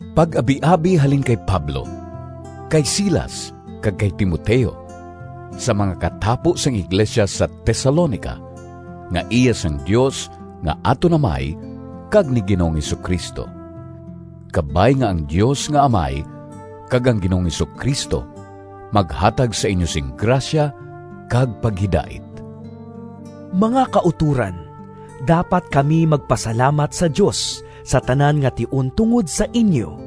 Pag-abiabi halin kay Pablo, kay Silas, kag kay Timoteo— Sa mga katapo sang iglesia sa Tesalonica, nga iya sang Dios nga aton Amay kag ni Ginoong Jesu-Cristo. Kabay nga ang Dios nga Amay kag ang Ginoong Jesu-Cristo maghatag sa inyo sing grasya kag paghidait. Mga kautoran, dapat kami magpasalamat sa Dios sa tanan nga tion tungod sa inyo.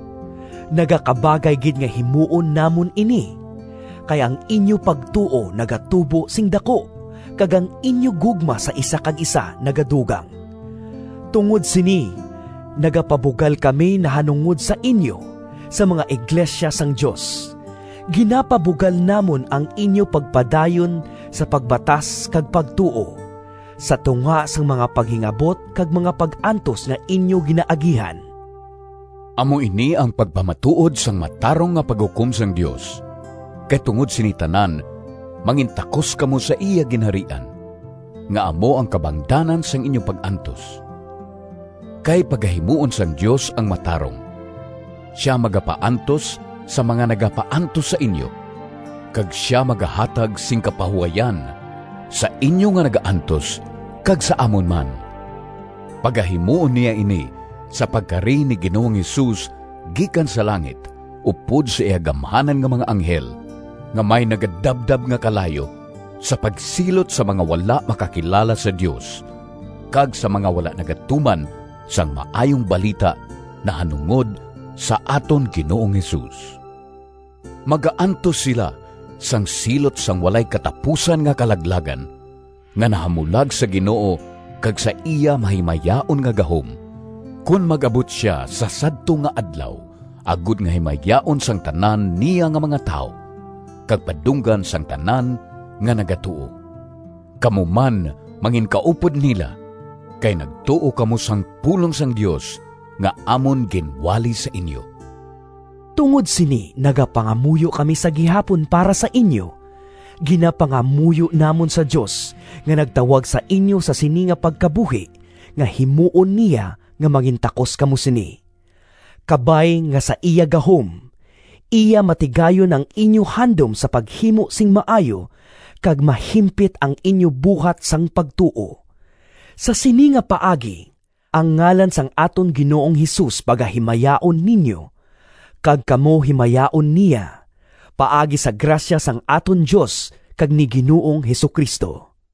Nagakabagay gid nga himuon namon ini, kay ang inyo pagtuo nagatubo sing daku kag ang inyo gugma sa isa kag isa nagadugang. Tungod sini nagapabugal kami nahanungod sa inyo sa mga iglesia sang Dios. Ginapabugal namon ang inyo pagpadayon sa pagbatas kag pagtuo, sa tunga sang mga paghingabot kag mga pag-antos nga inyo ginaagihan. Amo ini ang pagpamatuod sang matarong nga paghukom sang Dios, kay tungod sini tanan mangintakos kamo sa iya Ginharian, nga amo ang kabangdanan sang inyo pag-antos. Kay pagahimuon sang Dios ang matarong: sia magapaantos sa mga nagapaantos sa inyo, kag sia magahatag sing kapahuwayan sa inyo nga nagaantos, kag sa amon man. Pagahimuon niya ini sa pagkari ni Ginoong Jesus gikan sa langit upod sa iya gamhanan nga mga anghel, nga may nagadabdab nga kalayo, sa pagsilot sa mga wala makakilala sa Dios kag sa mga wala nagatuman sang Maayong Balita nahanungod sa aton Ginoong Jesus. Magaantos sila sang silot sang walay katapusan nga kalaglagan, nga nahamulag sa Ginoo kag sa iya mahimayaon nga gahom, kon mag-abot sia sa sadto nga Adlaw agod nga himayaon sang tanan niya nga mga tawo kag padunggan sang tanan nga nagatuo. Kamo man manginkaupod nila, kay nagtuo kamo sang pulong sang Dios nga amon ginwali sa inyo. Tungod sini nagapangamuyo kami sa gihapon para sa inyo. Ginapangayo namon sa Dios nga nagtawag sa inyo sa sini nga pagkabuhi nga himuon niya nga mangintakos kamo sini. Kabay nga sa iya gahom, iya matigayon ang inyo handom sa paghimo sing maayo kag mahimpit ang inyo buhat sang pagtuo. Sa sini nga paagi ang ngalan sang aton Ginoong Jesus pagahimayaon ninyo, kag kamo himayaon niya, paagi sa grasya sang aton Dios kag ni Ginoong Jesu-Cristo.